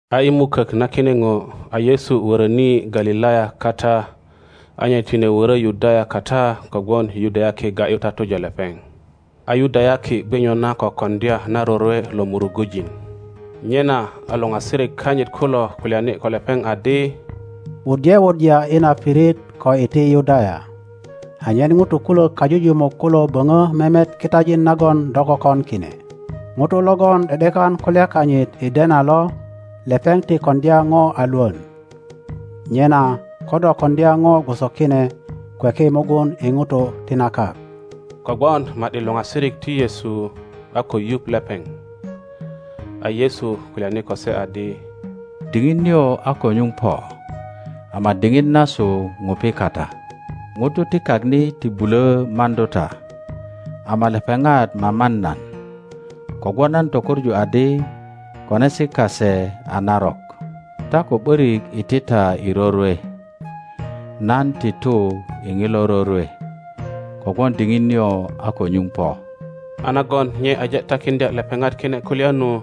A i mukök na kine ŋo a Yesu wöröni Galilaya kata, a nye tine wörö Yudaya kata kogwon Yudayaki ga ’yu tatuja lepeŋ. A Yudayaki gwe nyona ko koŋdya na rorwe lo Murugujin. Nyena a luŋasirik kanyit kulo kulyani ko lepeŋ adi, Wuddye wuddya i na pirit ko iti Yudaya, anyen ŋutu kulök kajujumuk kulo böŋö memet kitajin nagon do kökon kine. Ŋuto logon ’de ’dekan kulya kanyit i dena lo, lepeŋ ti koŋdya ŋo a Iwon. Nyena ko do koŋdya ŋo gwoso kine, kweki mugun i ŋutu ti na kak. Kogwon ma ’di luŋasirik ti Yesu a ko yuŋ lepeŋ. A Yesu kulyani ko se adi, Diŋit nio a ko nyuŋ po, ama diŋit nasu ŋupi kata. ŋutu ti kak ni ti bulö maŋdu ta, ama lepeŋat maman nan, kogwon nan tökoŋu adi konesi kase a narok. Ta ko ’borik iti ta i rorwe. Nan ti tu i ŋilo rorwe kogwon diŋit nio a ko nyuŋ po. A nagon nye aje takiŋdya lepeŋat kine kulya nu,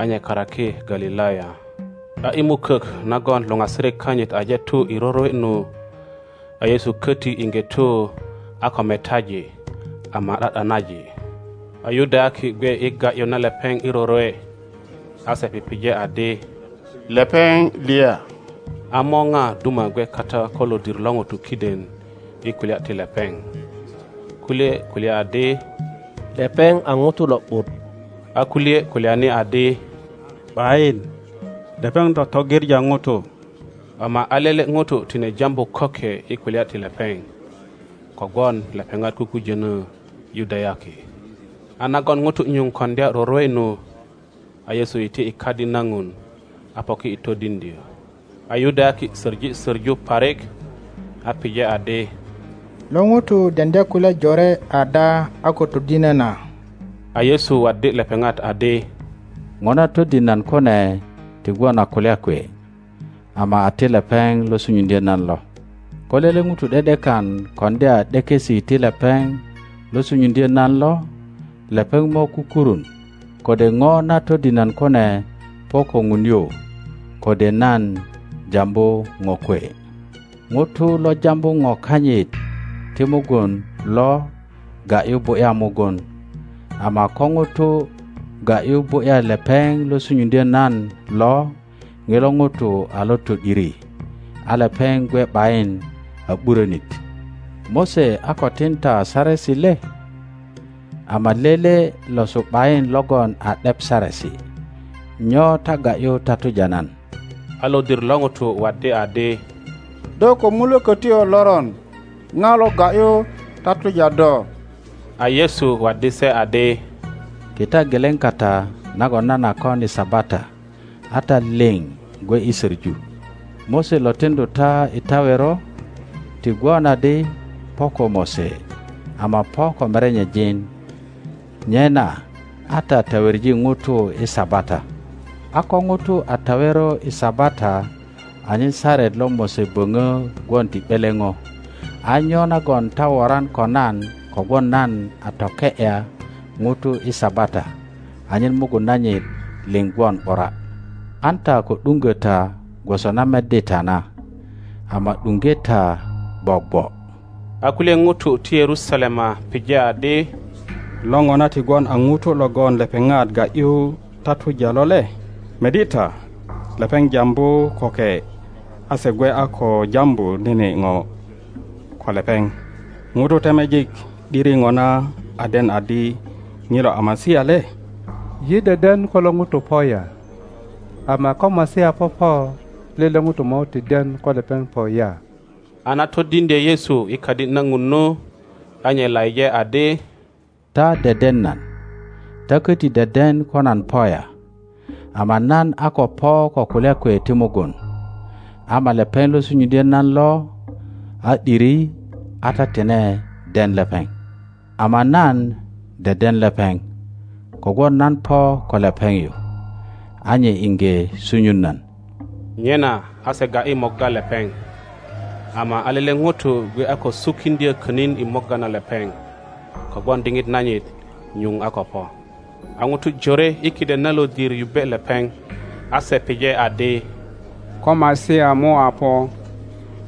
a nye karaki Galilaya. A i mukök nagon luŋasirik kanyit aje tu i rorwe nu, a Yesu koti iŋge tu a ko metaji ama ’da ’danaji. A Yudayaki gwe i ga ’yu na lepeŋ i rorwe, a se pije adi, Lepeŋ liya? A morja duma gwe kata ko lodir lo ŋutu kiden i kulya ti lepeŋ. Kulye kulya adi, Lepeŋ a ŋuto lo ’but, a kulye kulyani adi, ’Bayin, (lepeŋ totogiŋa ŋutu. Ama a lele ŋuto tine jambu köke i kulya ti lepeŋ, kogwon lepeŋat kukujönö Yudayaki. A nagon ŋutu nyuŋ koŋdya rorwe nu, a Yesu iti i Kadi na Ŋun, a poki i todiŋdyö. a Yudayaki söŋi soŋu parik, a pije adi, Lo ŋuto deŋdya kulya jore ada a ko todinö na? A Yesu waddi lepeŋat adi, Ŋo na todin nan kune ti gwon a kulya kwe, ama a ti lepeŋ lo sunyuŋdyö nan lo. Ko lele ŋuto ’de ’dekan koŋdya ’dekesi ti lepeŋ lo sunyuŋdyo nan lo, lepeŋ mo kukurun kode ŋo na todin nan kune po ko Ŋun yu, kode nan jambu ŋo kwe. Ŋuto lo jambu ŋo kanyit ti mugun lo ga ’yu bu ’ya mugun; ama ko ŋuto ga ’yu bu ’ya lepeŋ lo sunyuŋdyö nan lo ŋilo ŋuto a lo to ’diri, a lepeŋ gwe ’bayin a ’burönit. Mose a ko tin ta saresi le? Ama lele losu ’bayin logon a ’dep Saresi. Nyo ta ga ’yu tatuja nan? a lodir lo ŋutu waddi adi, Do ko mulokötyo loron! Ŋo lo ga ’yu tatuja do? A Yesu waddi se adi, Kita geleŋ kata nagon nan a kon i Sabata a ta liŋ gwe i soŋu. Mose lo tiŋdu ta i tawero, (ti gwon adi po ko Mose, ama po ko merenyejin); nyena a ta taweŋi ŋutu i Sabata. a ko ŋuto a tawero i Sabata anyen Saret lo Mose böŋö gwon ti ’beleŋo, a nyo nagon ta woran ko nan kogwon nan a toke ’ya ŋuto i Sabata anyen mugun nanyit liŋ gwon ’bura? An ta ko ’duŋgo ta gwoso na meddi ta na, ama ’duŋge ta gwogwo. A kulye ŋutu ti Yerusalema pije adi, Lo ŋona ti gwon a ŋuto logon lepeŋat ga ’yu tatuja lo le? Meddi ta, lepeŋ jambu köke a se gwe a ko jambu nene ŋo ko lepeŋ. Ŋutu temejik ’diri ŋona a den adi ŋilo a Masia le? Yi deden ko lo ŋuto po ya, ama ko Masia popo, lele ŋuto mo ti den ko lepeŋ po ya. A na todiŋdye Yesu i Kadi na Ŋun nu, a nye laije adi, Ta deden nan, ta köti deden ko nan po ya. Ama nan a ko po ko kulya kwe ti mugun, ama lepeŋ lo sunyuŋdyö nan lo a ’diri, a ta tine den lepeŋ. Ama nan deden lepeŋ kogwon nan po ko lepeŋ yu, a nye iŋge sunyun nan. Nyena a se ga ’yi morga lepeŋ, ama a lele ŋuto gwe a ko sukiŋdyö könin i morga na lepeŋ, kogwon diŋit nanyit nyuŋ a ko po. A ŋutu jore i kiden na lodir yubbe lepeŋ; a se pije adi, Ko Masia mo a po,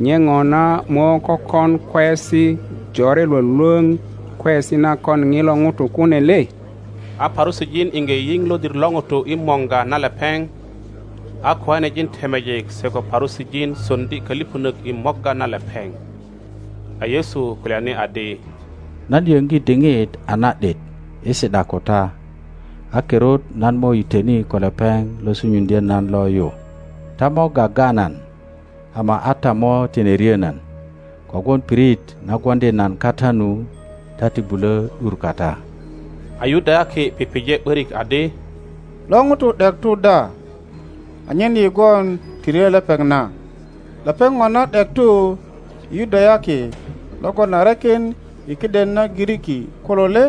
nye ŋona mo kökon kweyesi jore lwölwöŋ kweyesi na kon ŋilo ŋuto kune le? A Parusijin iŋge yiŋ lodir lo ŋutu i morga na lepeŋ, a kiŋanejin temejik se ko Parusijin soŋdi kölipönök i morga na lepeŋ. a Yesu kulyani adi, Nan yöŋgi diŋit a na ’dit i si ’da ko ta, a kirut nan mo yitöni ko lepeŋ lo sunyuŋdyö nan lo yu. Ta mo gaga nan, ama a ta mo tine ryö nan, kogwon pirit na gwoŋdi nan kata nu ta ti bulö ’dur kata. A Yudayaki pije ’borik adi, Lo ŋuto ’dek tu da anyen yi gwon ti ryö lepeŋ na? Lepeŋ ŋona ’dek tu i Yudayaki logon a rekin i kiden na Giriki kulo le,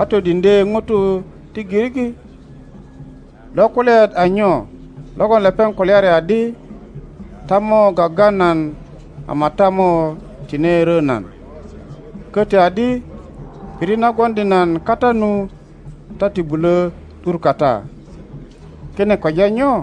a todiŋdye ŋutu ti Giriki? Lo kulyaet a nyo logon lepeŋ kulyari adi, Ta mo gaga nan ama a ta mo tine ryö nan? Koti adi, Pirit na gwoŋdi nan kata nu ta ti bulo ’dur kata. Kine kweja nyo?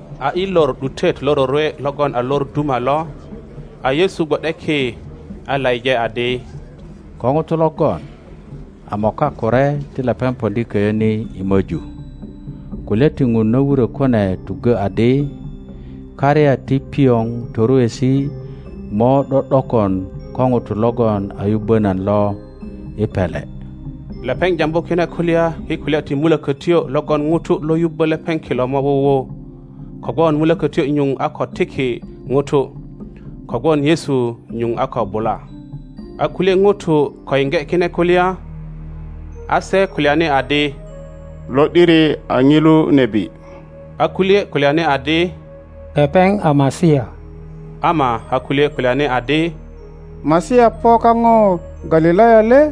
A i lor ’dutet lo rorwe logon a lor duma lo, a Yesu gwo ’de ki a laije adi, Ko ŋuto logon a moka kure, ti lepeŋ poŋdi köyö ni i möju. Kulya ti ŋun na wurö kune tuggö adi, Karya ti pioŋ toruesi mo ’do ’dokon ko ŋuto logon a yubbö nan lo i pele. Lepeŋ jambu kine kulya i kulya ti Mulökötyo logon ŋutu lo yubbö lepeŋ kilo mo wuwu, kogwon Mulokötyo nyuŋ a ko tiki ŋutu, kogwon Yesu nyuŋ a ko bula. A kulye ŋutu ko yiŋge kine kulya, a se kulyani adi, Lo ’diri a ŋilu nebi. A kulye kulyani adi, Lepeŋ a Masia; ama a kulye kulyani adi, Masia po kaŋo Galilaya le?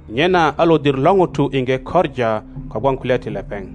Nyena a lodir lo ŋutu iŋge koŋa kogwon kulya ti lepeŋ.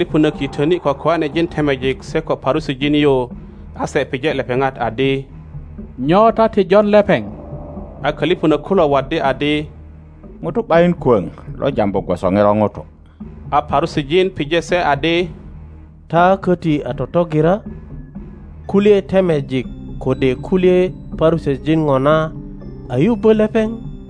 A kölipönök yitöni ko köanejin temejik se ko Parusijin yu, a se pije lepeŋat adi, Nyo ta ti jon lepeŋ? a kölipönök kulo waddi adi, Ŋuto ’bayin kwoŋ lo jambu gwoso ŋilo ŋuto. A Parusijin pije se adi, Ta köti a totogira? Kulye temejik kode kulye Parusijin ŋona a yubbö lepeŋ?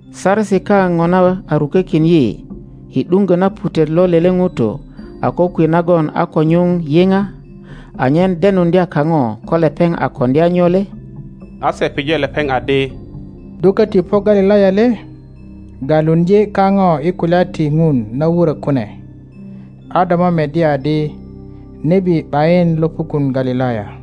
Saresi kao ŋona a rukökin yi i ’duŋgö na putet lo lele ŋuto a kokwe nagon a ko nyuŋ yiŋ, anyen denuŋdya kaŋo ko lepeŋ a koŋdya nyo le? A se pije lepeŋ adi, Do köti po Galilaya le? Galuŋdye kaŋo i kulya ti Ŋun na wurö kune, a do mo meddi adi, nebi ’bayin lo pukun Galilaya.